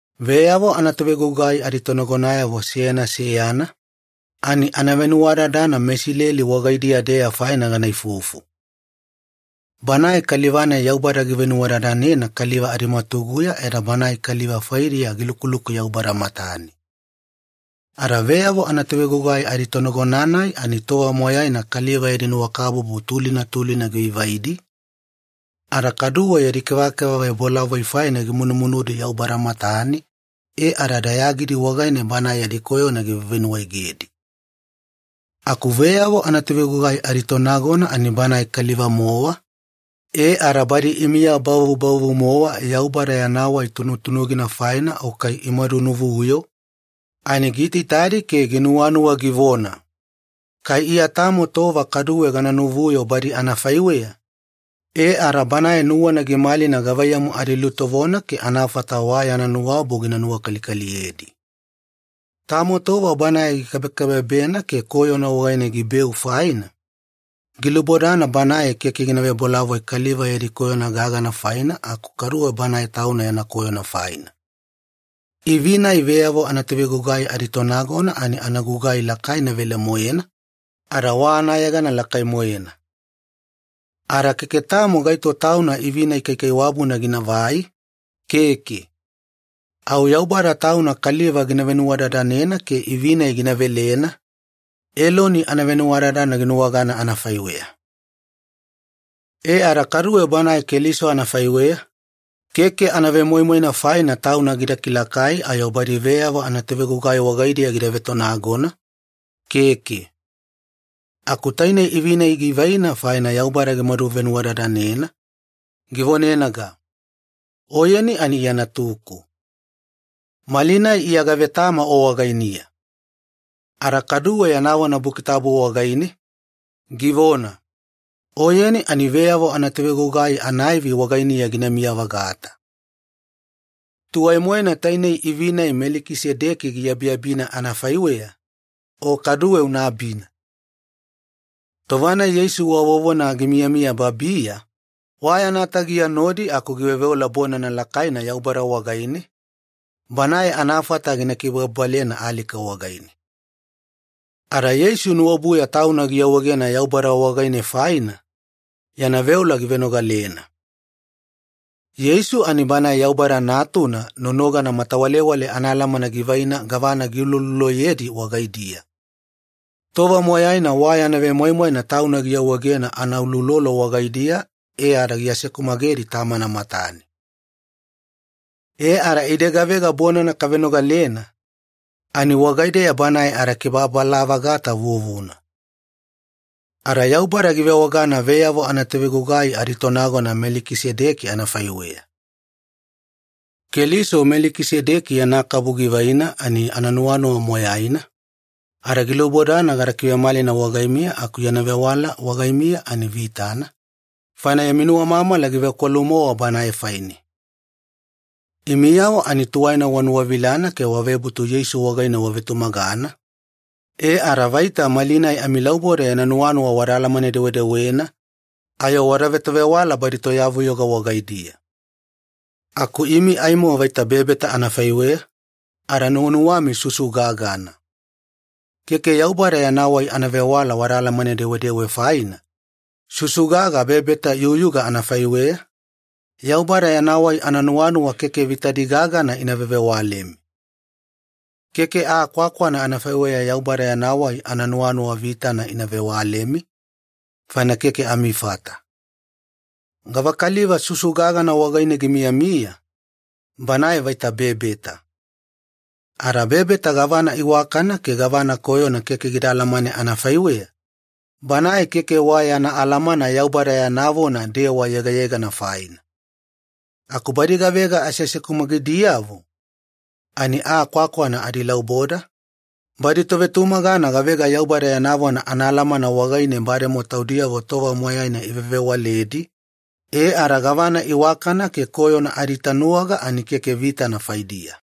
Veyavo anatovegugai aditonagonayavo seyana seyana, ani anavenuwadadana meIsileli wagaidiya-deya faina gana ifufu. Banae kaliva-nai Yaubada givenuwadadanena kaliva adimwatuguya ada banae kaliva faidiya gilukuluku Yaubada matane. Ada veyavo anatovegugai aditonagona-nai ani tova moyaina kaliva yadi nuwakabubu tulina tulina givaivaidi, ada kaduwe yadi kevakeva vebolavoi faina gimunumunudi Yaubada matane e ada dayagidi wagaine Banae yadi koyona givevenuwaegedi. Aku veyavo anatovegugai aditonagona ani banae kaliva-mowa, e ada badi imiya bavubavu-mowa Yaubada yana wai tunutunugina faina o kai imadunuvuyo, ani giitaitadi ke ginuwanuwa givona, “Kai Iya tamo tova kaduwe gana nuvuyo badi anafaiweya,” e ada banae nuwana gimalina gavaiyamu adilutovona ke anafata wa yana nuwaobu gina nuwakalikaliyedi. Tamo tova banae gikabekabebena ke koyona wagaine gibeu faina, gilubodana banae keke gina vebolavoi kaliva yadi koyona gagana faina, aku kaduwe banae tauna yana koyona faina. Ivi-nai veyavo anatovegugai aditonagona ani anagugai lakaina velemoena, ada wa anayegana lakai-moena. Ada keke tamo gaito tauna ivi-nai kaikaiwabuna ginavai, keke. Au Yaubada Tauna kaliva gina venuwadadanena ke ivi-nai gina velena, Eloni anavenuwadadana ginuwagana anafaiweya. E ada kaduwe Bana Keliso anafaiweya, keke anavemoimoina faina Tauna gida kilakai ayo badi veyavo anatovegugai wagaidiya gida vetonagona, keke. Aku tainei ivi-nai givaina faina Yaubada gimadu venuwadadanena, givonenaga, “Oyeni ani Iya Natuku. Malinai Iya gavetama O wagainiya.” Ada kaduwe yana vona Buki Tabu wagaine, givona, “Oyeni ani veyavo anatovegugai anaivi wagainiya ginamiya-vagata. Tuwai-moena tainei ivi-nai Melikisedeki giabiabina anafaiweya, O kaduwe una abina.” Tova-nai Yeisu wa vovona gimiyamiya babiya, wa yana tagiya nodi aku giveoveola bonana lakaina Yaubada wagaine, Banae anafata gina kibababalena alika wagaine. Ada Yeisu nuwaobuya Tauna giawaegena Yaubada wagaine faina, yana veola givenogalena. Yeisu ani Banae Yaubada Natuna nonogana matawalewale anaalamana givaina gavana giulouloloyedi wagaidiya. Tova moyaina wa yana vemoimoina Tauna giawaegena anauloulolo wagaidiya e ada giasekumagedi Tamana matane. E ada ide gavega bonana kavenogalena, ani wagaideya Banae adakibababala-vagata vuvuna. Ada Yaubada givewagana veyavo anatovegugai aditonagona Melikisedeki anafaiweya. Keliso Melikisedeki yana kabu givaina ani ananuwanuwa moyaina, ada gilubodana gada kivemalina wagaimiya aku yana vewala wagaimiya ani vitana, faina yami nuwamamala givekwalu-mowa Banae faine. Imiyavo ani tuwaina wanuwavilana ke wavebutu Yeisu wagaine wavetumagana, e ada vaita malinai amilauboda yana nuwanuwa wada alamane-dewedewena ayo wada vetovewala badi toyavuyoga wagaidiya. Aku imi aimo vaita bebeta anafaiweya, ada nuwanuwami susu gagana. Keke Yaubada yana wai anavewala wada alamane-dewedewe faina, susu gaga bebeta iyuyuga anafaiweya, Yaubada yana wai ananuwanuwa keke vitadi gagana ina vevewalemi. Keke aa kwakwana anafaiweya Yaubada yana wai ananuwanuwa vitana ina vewalemi, faina keke amifata. Gavakaliva susu-gagana wagaine gimiyamiya, banae vaita bebeta. Ada bebeta gavana iwakana ke gavana koyona keke gida alamane anafaiweya, banae keke wa yana alamana Yaubada yana vona dewa yegayegana faina. Aku badi gavega aseasekumagidiyavo, ani aa kwakwana adilauboda, badi tovetumagana gavega Yaubada yana vona anaalamana wagaine bademowa taudiyavo tova moyaina ivevewaledi, e ada gavana iwakana ke koyona adiitanuwaga ani keke vitana faidiya.